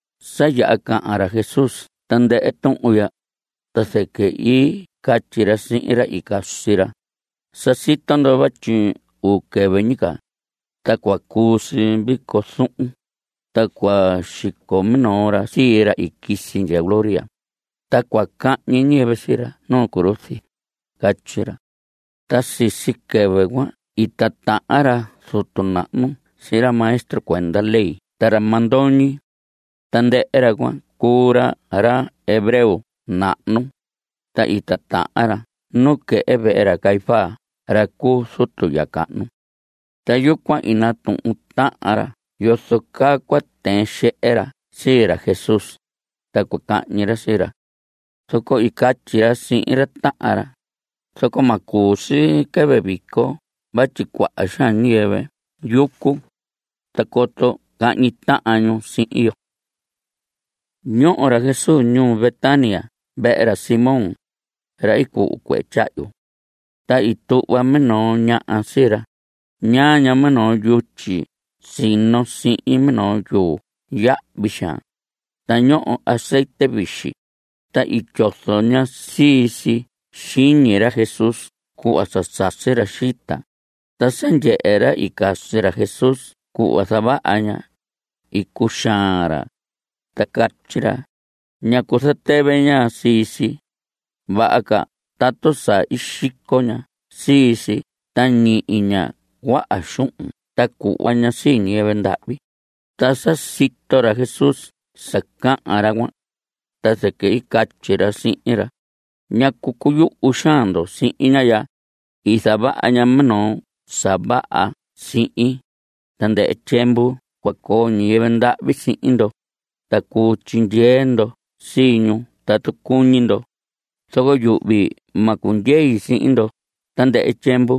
Sa yaha cahan ra Jesús tandɨhɨ tuhun ya, ta zɨquɨ i catyi ra sihin ra i casi ra: Sa sito ndo vatyi uu quɨvɨ ñi ca, ta cua cuu si vico zuhun, ta cua xico minoo ra sii ra i quisi ndya gloria, ta cua cahñi ñiyɨvɨ sii ra nu cruz. Catyi ra. Ta sisi quɨvɨ cuan i titahan ra zutu nahnu sihin ra maestro cuenda ley ta ra mandoñi. Tandɨhɨ ra cuan cuu ra ra hebreo nahnu, ta i titahan ra nuquehe vehe ra Caífas ra cu zutu ya cahnu. Ta yucuan i natuhun tahan ra yozo caa cua tɨɨn xehe ra sii ra Jesús, ta cua cahñi ra sii ra. Zoco i catyi ra sihin ra tahan ra: Zoco ma cuu si quɨvɨ vico vatyi cuaha xaan ñiyɨvɨ yucu, ta coto cahñi tahan ñu sihin yo. Ñoho ra Jesús ñuu Betania vehe ra Simón, ra i cuhu cuehe tyahyu. Ta i tuhva minoo ñaha sii ra. Ñaa ña minoo yutyi sino sihin minoo yuu yahvi xaan, ta ñoho azetye vixi. Ta i tyozo ña sii si xiñi ra Jesús cuhva sa sasi ra xita. Ta sa ndyehe ra i casi ra Jesús cuhva zavaha ña, i cuxaan ra, ta catyi ra: ¿Ñacu zatɨvɨ ña sii si? Vaha ca tatu sa i xico ña sii si ta ñihi ña cuaha xuhun ta cuhva ña sii ñiyɨvɨ ndahvi. Ta sa sito ra Jesús sa cahan ra cuan, ta zɨquɨ i catyi ra sihin ra: ¿Ñacu cuyuhu xaan ndo sihin ñaha ya? I zavaha ña minoo sa vaha sihin. Tandɨhɨ tyiemvu cua coo ñiyɨvɨ ndahvi sihin ndo, ta cuu tyindyee ndo sii ñu tatu cuñi ndo. Zoco yuhvi ma cundyei sihin ndo tandɨhɨ tyiemvu.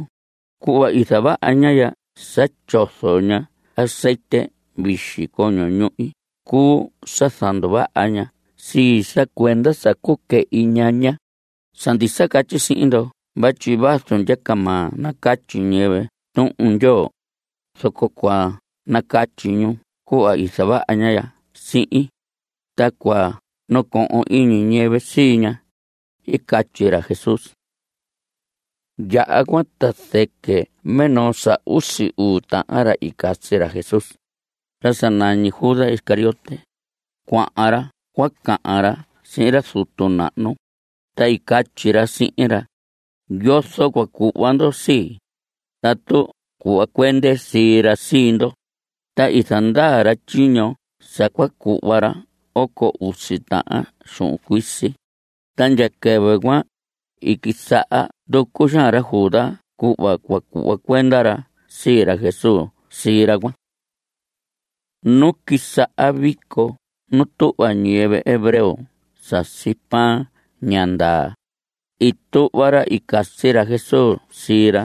Cuhva i zavaha ña ya sa tyozo ña azetye vixi coño ñuhi cuu sa zanduvaha ña sii, sa cuenda sa cuquɨhi ñaña. Sa ndisa catyi sihin ndo vatyi vazu ndyacamaa nacatyi ñiyɨvɨ Tuhun Ndyoo, zoco cua nacatyi ñu cuhva i zavaha ña ya sihin, ta cua nacohon iñi ñiyɨvɨ sii ña. I catyi ra Jesús. Yaha cuan ta zɨquɨ minoo sa usi uu tahan ra i casi ra Jesús, ra sa nañi Judas Iscariote, cuahan ra cua cahan ra sihin ra zutu nahnu. Ta i catyi ra sihin ra: ¿Yozo cua cuhva ndo sii, tatu cuhva cuende sii ra sii ndo? Ta i zandaa ra tyiño sa cua cuhva ra oco usi tahan xuhun cuisi. Ta ndya quɨvɨ cuan, i quisaha nducu xaan ra Judas cuhva cua cuhva cuenda ra sii ra Jesús sii ra cuan. Nu quisaha vico nu tuhva ñiyɨvɨ hebreo sasi pan ña ndaa, i tuhva ra i casi ra Jesús sii ra,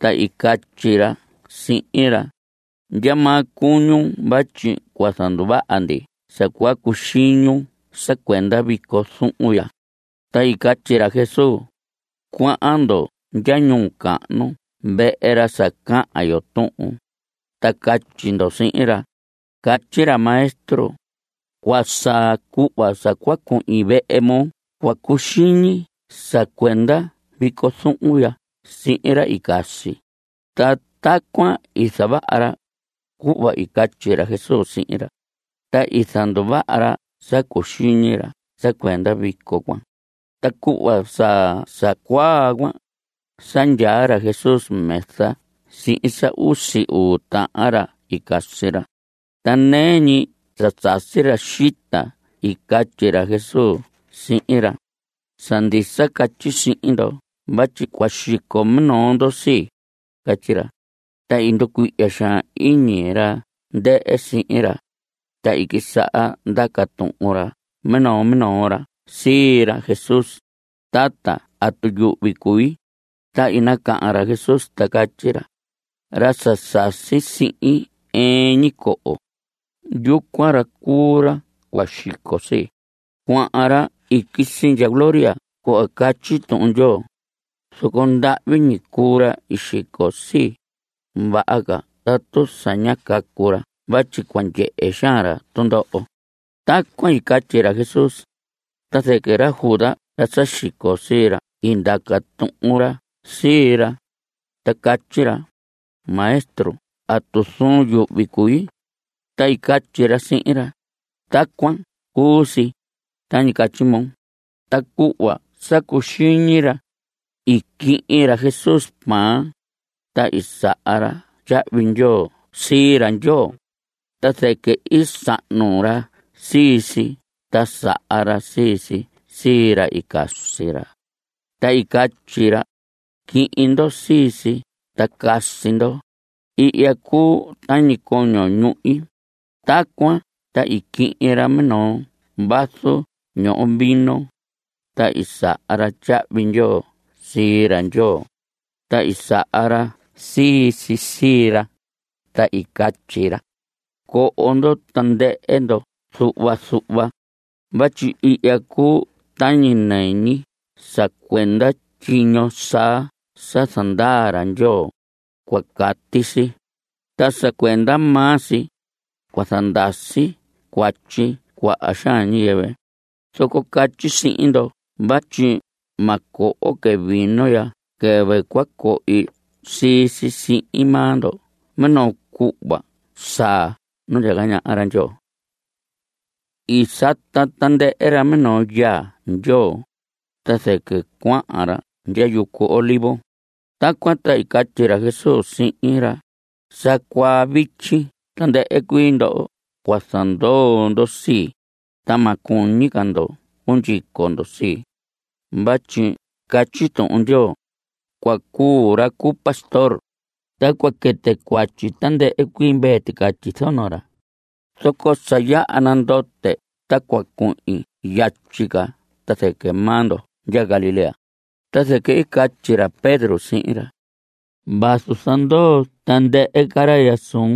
ta i catyi ra sihin ra: ¿Ndyamaa cuñun vatyi cua zanduvaha ndi sa cua cuxiñun sa cuenda vico zuhun ya? Ta i catyi ra Jesús: Cuahan ndo ndya ñuu cahnu vehe ra sa cahan yo tuhun, ta catyi ndo sihin ra: “Catyi ra Maestro, cua saa cuhva sa cua cui. Vehe moo cua cuxiñi sa cuenda vico zuhun ya sihin ra i casi.” Ta tacuan i zavaha ra, cuhva i catyi ra Jesús sihin ra, ta i zanduvaha ra sa cuxiñi ra sa cuenda vico cuan. Ta cuhva sa sa cuaa cuan, sa ndyaa ra Jesús mesa sihin sa usi uu tahan ra i casi ra. Ta nɨɨ ñi sa sasi ra xita i catyi ra Jesús sihin ra: Sa ndisa catyi sihin ndo vatyi cua xico minoo ndo sii. Catyi ra. Ta i nducuihya xaan iñi ra ndɨhɨ sihin ra, ta i quisaha ndaca tuhun minoo minoo ra sii ra Jesús: Tata, ¿atu yuhvi cui? Ta i nacahan ra Jesús, ta catyi ra: Ra sa sasi sihin ɨɨn ñi coho, yucuan ra cuu ra cua xico sii. Cuahan ra i quisi ndya gloria cuhva catyi Tuhun Ndyoo; zoco ¡ndahvi ñi cuu ra xico sii! Vaha ca tatu sa ñá cacu ra vatyi cua ndyehe xaan ra tundoho. Tacuan i catyi ra Jesús, ta zɨquɨ ra Judas ra sa xico sii ra i ndaca tuhun ra sii ra, ta catyi ra: Maestro, ¿atu zuun yuhvi cui? Ta i catyi ra sihin ra: Tacuan cu si, tañi catyi moo. Ta cuhva sa cuxiñi ra, i quihin ra Jesús pan, ta i saha ra tyahvi ndyoo sii ra Ndyoo, ta zɨquɨ i sahnu ra sii si ta saha ra sii si sii ra i casi ra, ta i catyi ra: Quihin ndo sii si ta casi ndo. Ihya cuu tañi coño ñuhi. Tacuan ta i quihin ra minoo vaso ñoho vino, ta i saha ra tyahvi ndyoo sii ra Ndyoo, ta i saha ra sii si sii ra, ta i catyi ra: Coho tandɨhɨ ndo zuhva zuhva vatyi ihya cuu tañi nɨñi sa cuenda tyiño saa sa zandaa ra Ndyoo. Cua cati si, ta sa cuenda maa si, cua ndasi cuatyi cuaha xaan ñiyɨvɨ. Zoco catyi sihin ndo vatyi ma coho que vino ndya quɨvɨ cua cohi sii si sihin maa ndo minoo cuhva saa nu ndyaca ñaha ra Ndyoo. I sata tandɨhɨ ra minoo yaa Ndyoo, ta zɨquɨ cuahan ra ndya yucu Olivos. Tacuan ta i catyi ra Jesús sihin ra: Sa cuaa vityi tandɨhɨ cuii ndo cua zandoo ndo sii. Ta ma cuñi ca ndo cundyico ndo sii, vatyi catyi Tuhun Ndyoo: “Cua cuu ra cu pastor, ta cua quɨtɨ cuatyi tandɨhɨ cuii mvee ticatyi zono ra.” Zoco sa yaha nandote ta cua cuhin yatyi ca ta zɨquɨ maa ndo ndya Galilea. Ta zɨquɨ i catyi ra Pedro sihin ra: Vazu zandoo tandɨhɨ ca ra ya suun,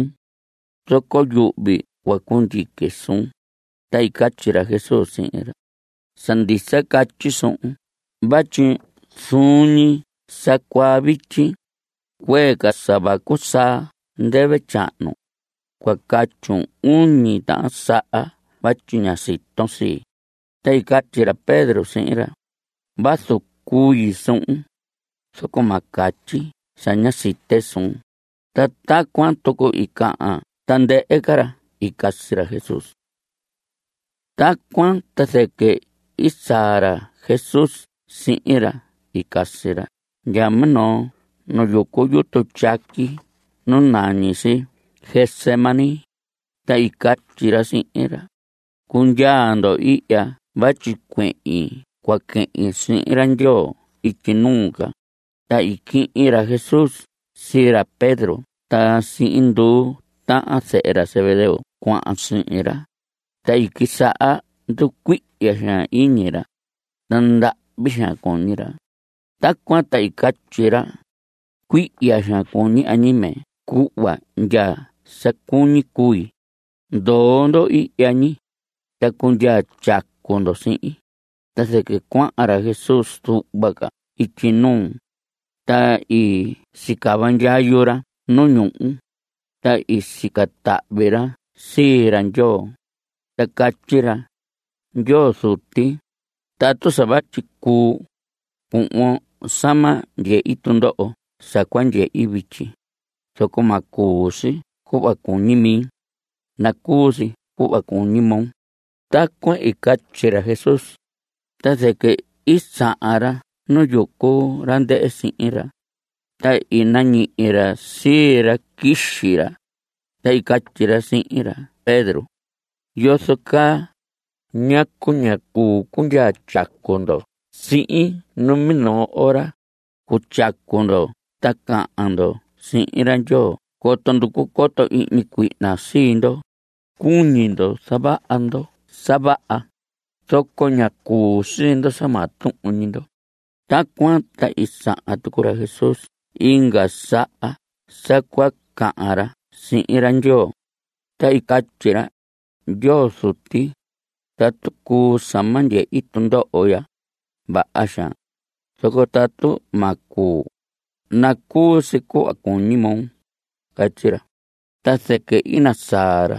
zoco yuhvi cua cundyique suun. Ta i catyi ra Jesús sihin ra: Sa ndisa catyi suhun vatyi zuun ñi sa cuaa vityi, cuee ca sa vacu saa ndɨvɨ tyahnu, cua catyun uñi tahan saha vatyi ña siton sii. Ta i catyi ra Pedro sihin ra: Vazu cui suhun, zoco ma catyi sa ña site suun. Ta tacuan tucu i cahan tandɨhɨ ca ra i casi ra Jesús. Tacuan ta zɨquɨ i saa ra Jesús sihin ra i casi ra ndya minoo nu yucu yutu tyaqui nu nañi si Getsemaní, ta i catyi ra sihin ra: Cundyaa ndo ihya vatyi cuehin cua quehin sihin ra Ndyoo ityi nuu ca. Ta i quihin ra Jesús sii ra Pedro ta sii nduu tahan zehe ra Zebedeo cuahan sihin ra, ta i quisaha nducuihya xaan iñi ra, ta ndahvi xaan cuñi ra. Tacuan ta i catyi ra: Cuihya xaan cuñi añime cuhva ndya sa cuñi cui. Ndoo ndo ihya ñi, ta cundyaa tyacu ndo sihin. Ta zɨquɨ cuahan ra Jesús zuhva ca ityi nuu, ta i sicava ndyayu ra nu ñuhu, ta i sica tahvi ra sii ra Ndyoo, ta catyi ra: Ndyoo Zuti, tatu sa vatyi cuu, cuhvon sa ma ndyehi tundoho sa cua ndyehi vityi, zoco ma cuu si cuhva cuñi mi, nacuu si cuhva cuñi moo. Tacuan i catyi ra Jesús, ta zɨquɨ i sahan ra nu yucu ra ndɨhɨ sihin ra, ta i nañihi ra sii ra quixi ra, ta i catyi ra sihin ra Pedro: ¿Yozo caa? ¿Ñacu ñá cuu cundyaa tyacu ndo sihin numinoo ora? Cutyacu ndo ta cahan ndo sihin ra Ndyoo coto nducu coto ihñi cuihna sii ndo. Cuñi ndo zavaha ndo sa vaha, zoco ña cuu sii ndo sa maa tuhun ñi ndo. Tacuan ta i sahan tucu ra Jesús inga saha sa cua cahan ra sihin ra Ndyoo, ta i catyi ra: Ndyoo Zuti, tatu cuu sa ma ndyehi tundoho ya, vaha xaan, zoco tatu ma cuu, nacuu si cuhva cuñi moo. Catyi ra. Ta zɨquɨ i nasaa ra,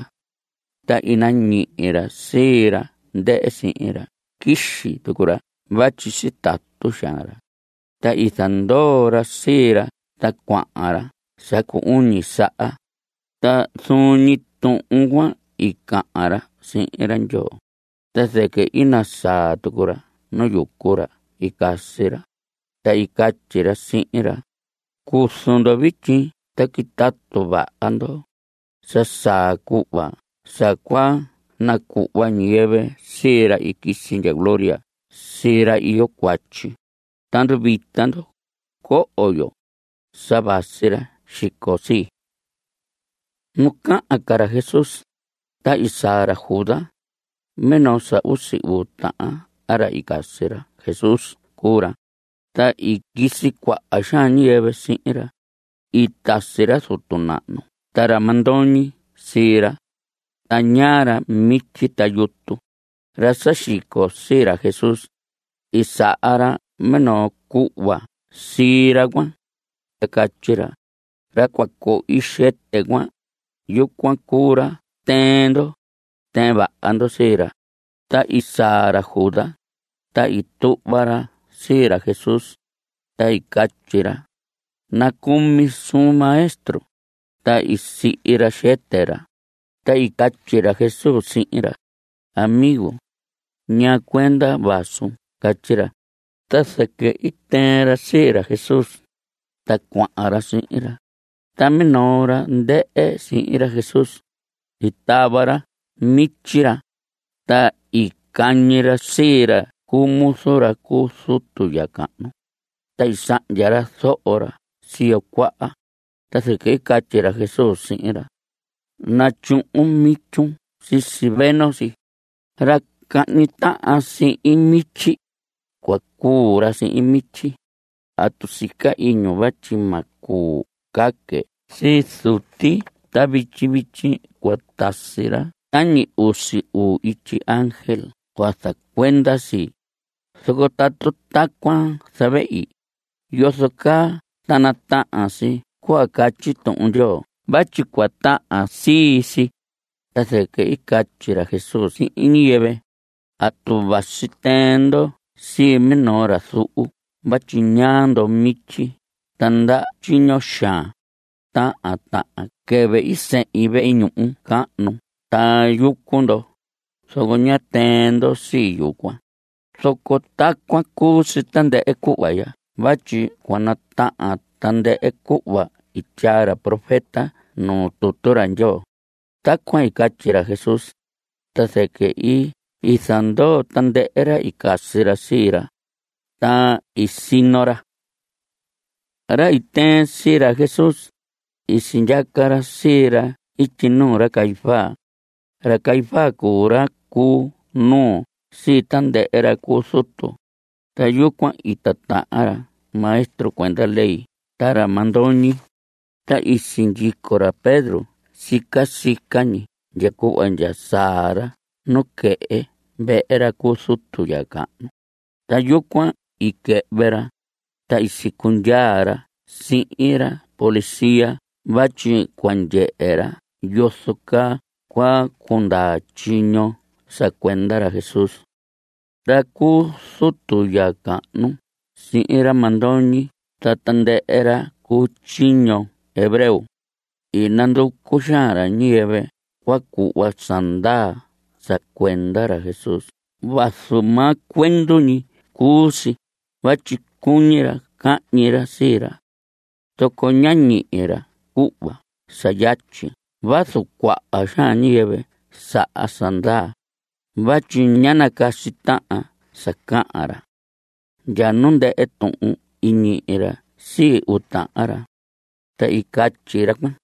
ta i nañihi ra sii ra ndɨhɨ sihin ra quixi tucu ra vatyi sitatu xaan ra. Ta i zandoo ra sii ra, ta cuahan ra sa cu uñi saha, ta zuun ñi tuhun cuan i cahan ra sihin ra Ndyoo. Ta zɨquɨ i nasaa tucu ra nu yucu ra i casi ra, ta i catyi ra sihin ra: Cuzu ndo vityi, ta quitatu vaha ndo. Sa saa cuhva sa cua nacuhva ñiyɨvɨ sii ra i quisi ndya gloria sii ra iyo cuatyi. Ta nduvita ndo. Coho yo. Sa vasi ra xico sii. Nu cahan ca ra Jesús, ta i saa ra Judas; minoo sa usi uu tahan ra i casi ra Jesús cuu ra. Ta i quisi cuaha xaan ñiyɨvɨ sihin ra. I tasi ra zutu nahnu ta ra mandoñi sii ra, ta ñaa ra mityi ta yutu. Ra sa xico sii ra Jesús, i saha ra minoo cuhva sii ra cuan, ta catyi ra: Ra cua cohi xɨtɨ cuan, yucuan cuu ra tɨɨn ndo. Tɨɨn vaha ndo sii ra. Ta i saa ra Judas, ta i tuhva ra sii ra Jesús, ta i catyi ra: Nacumi suun, Maestro. Ta i sihi ra xɨtɨ ra. Ta i catyi ra Jesús sihin ra: Amigo, ¿ñaa cuenda vasun? Catyi ra. Ta zɨquɨ i tɨɨn ra sii ra Jesús, ta cuahan ra sihin ra. Ta minoo ra ndɨhɨ sihin ra Jesús, i tava ra mityi ra, ta i cañi ra sii ra cu muzu ra cu zutu ya cahnu, ta i sahndya ra zoho ra siyo cuaha. Ta zɨquɨ i catyi ra Jesús sihin ra: Natyuhun mityun sisi veno si. Ra cahñi tahan sihin mityi, cua cuu ra sihin mityi. ¿Atu sica iñun vatyi ma cuu caque sii Zuti ta vityi vityi cua tasi ra tañi usi uu ityi ángel cua zacuenda sii? Zoco tatu tacuan zavehi, ¿yozo caa ta natahan si cuhva catyi Tuhun Ndyoo vatyi cua tahan si sii? Ta zɨquɨ i catyi ra Jesús sihin ñiyɨvɨ: ¿Atu vasi tɨɨn ndo sii minoo ra zuhu vatyi ñaa ndo mityi ta ndaha tyiño xaan? Tahan tahan quɨvɨ i sehin vehe ñuhu cahnu ta yucu ndo, zoco ñá tɨɨn ndo sii yucuan. Zoco tacuan cu si tandɨhɨ cuhva ya vatyi cua natahan tandɨhɨ cuhva i tyaa ra profeta nuu tutu ra Ndyoo. Tacuan i catyi ra Jesús, ta zɨquɨ i zandoo tandɨhɨ ra i casi ra sii ra, ta i sino ra. Ra i tɨɨn sii ra Jesús, i sindyaca ra sii ra ityi nuu ra Caifás. Ra Caifás cuu ra cu nuu sii tandɨhɨ ra cu zutu. Ta yucuan i titahan ra maestro cuenda ley ta ra mandoñi. Ta i sindyico ra Pedro sica sica ñi ndya cuhva ndya saa ra nuquehe vehe ra cu zutu ya cahnu, ta yucuan i quɨhvɨ ra, ta i sicundyaa ra sihin ra policía vatyi cua ndyehe ra yozo caa cua cundaa tyiño sa cuenda ra Jesús. Ra cu zutu ya cahnu sihin ra mandoñi ta tandɨhɨ ra cu tyiño hebreo, i nanducu xaan ra ñiyɨvɨ cua cuhva sa ndaa sa cuenda ra Jesús vazu maa cuendu ñi cuu si vatyi cuñi ra cahñi ra sii ra. Zoco ñá ñihi ra cuhva sa yatyi vazu cuaha ñiyɨvɨ saha sa ndaa, vatyi ñá nacasi tahan sa cahan ra. Ndya nu ndɨhɨ tuhun i ñihi ra sii uu tahan ra. Ta i catyi ra cuan: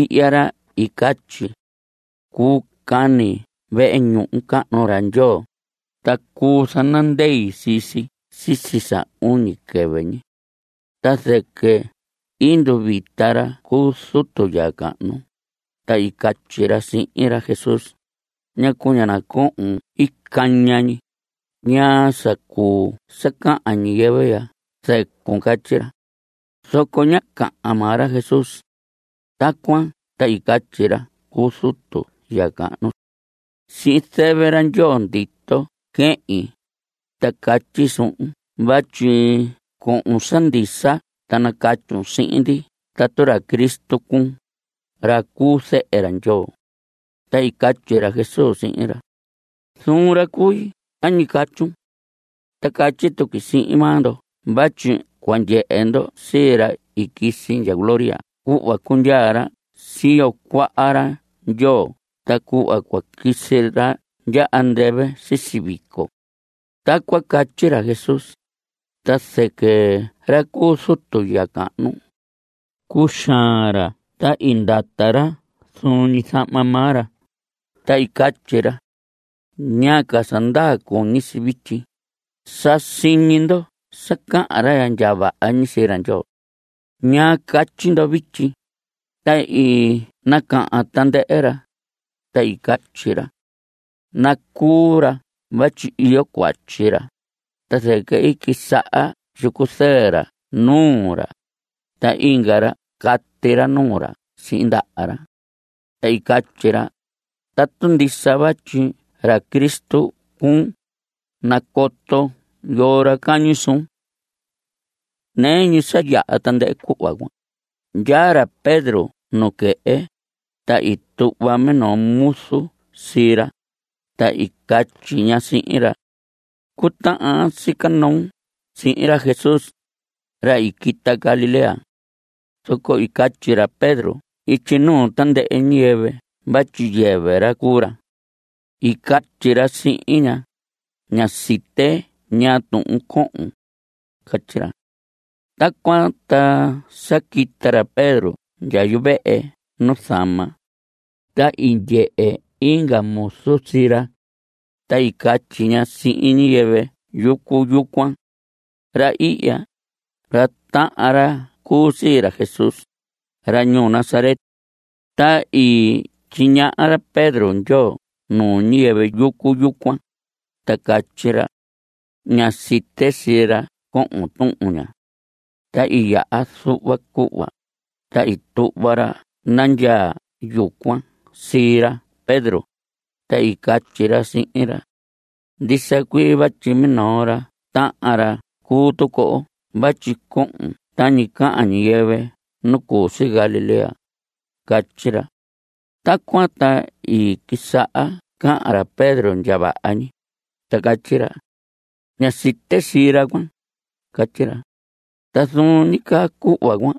Ihya ra i catyi: “Cuu cani vehe ñuhu cahnu ra Ndyoo, ta cuu zanandei sii si sisi sa uñi quɨvɨ ñi.” Ta zɨquɨ i nduvita ra cu zutu ya cahnu, ta i catyi ra sihin ra Jesús: ¿Ñacu ña nacohon ii caña ñi? ¿Ñaa sa cuu sa cahan ñiyɨvɨ ya zɨcun? Catyi ra. Zoco ñá nacahan maa ra Jesús. Tacuan ta i catyi ra cu zutu ya cahnu: Sihin zɨvɨ ra Ndyoo ndito quehin, ta catyi suhun vatyi cohon sa ndisa ta nacatyun sihin ndi tatu ra Cristo cuun, ra cu Zehe ra Ndyoo. Ta i catyi ra Jesús sihin ra: Zuun ra cui tañi catyun. Ta catyi tuqui sihin maa ndo vatyi cua ndyehe ndo sii ra i quisi ndya gloria cuhva cundyaa ra siyo cuaha ra Ndyoo ta cuhva cua quisi ra ndya andɨvɨ sisi vico. Tacuan catyi ra Jesús, ta zɨquɨ ra cu zutu ya cahnu, cuxaan ra ta i ndata ra zuun ñi zahma maa ra, ta i catyi ra: ¿Ñaa ca sa ndaa cuñi si vityi? Sa siñi ndo sa cahan ra ndya vaha ñi sii ra Ndyoo. ¿Ñaa catyi ndo vityi? Ta i nacahan tandɨhɨ ra, ta i catyi ra: Nacuu ra vatyi iyo cuatyi ra. Ta zɨquɨ i quisaha tyicu zɨɨ ra nuu ra, ta inga ra cati ra nuu ra sihin ndaha ra. Ta i catyi ra: Tatu ndisa vatyi ra Cristo cuun, nacoton yoo ra cañi suun. Nɨɨ ñi sa yaha tandɨhɨ cuhva cuan, ndyaa ra Pedro nuquehe, ta i tuhva minoo muzu sii ra, ta i catyi ña sihin ra: Cutahan aan sica noon sihin ra Jesús, ra i quita Galilea. Zoco i catyi ra Pedro ityi nuu tandɨhɨ ñiyɨvɨ vatyi yɨvɨ ra cuu ra. I catyi ra sihin ña: Ña site ñaa tuhun cohon. Catyi ra. Tacuan ta sa quita ra Pedro ndya yuvehe nuzama, ta i ndyehe inga muzu sii ra, ta i catyi ña sihin ñiyɨvɨ yucu yucuan: Ra ihya, ra tahan ra cuu sii ra Jesús, ra ñuu Nazaret. Ta i tyiñaha ra Pedro ndyoo nuu ñiyɨvɨ yucu yucuan, ta i catyi ra: Ña site sii ra cohon tuhun ña. Ta i yaha zuhva cuhva, ta i tuhva ra nandyaa yucuan sii ra Pedro, ta i catyi ra sihin ra: Ndisa cuii vatyi minoo ra tahan ra cuu tucu oo vatyi cohon tañi cahan ñiyɨvɨ nu cu si Galilea. Catyi ra. Tacuan ta i quisaha cahan ra Pedro ndya vaha ñi, ta catyi ra: Ña site sii ra cuan. Catyi ra. Ta zuun ñi caa cuhva cuan,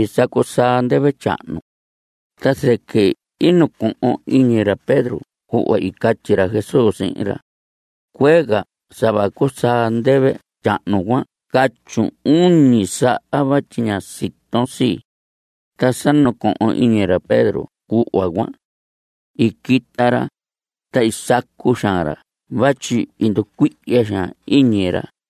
i sacu saa ndɨvɨ tyahnu. Ta zɨquɨ i nacohon iñi ra Pedro cuhva i catyi ra Jesús sihin ra: “Cuee ca sa vacu saa ndɨvɨ tyahnu, cua catyun uñi saha vatyi ña siton sii.” Ta sa nacohon iñi ra Pedro cuhva cuan, i quita ra, ta i sacu xaan ra vatyi i nducuihya xaan iñi ra.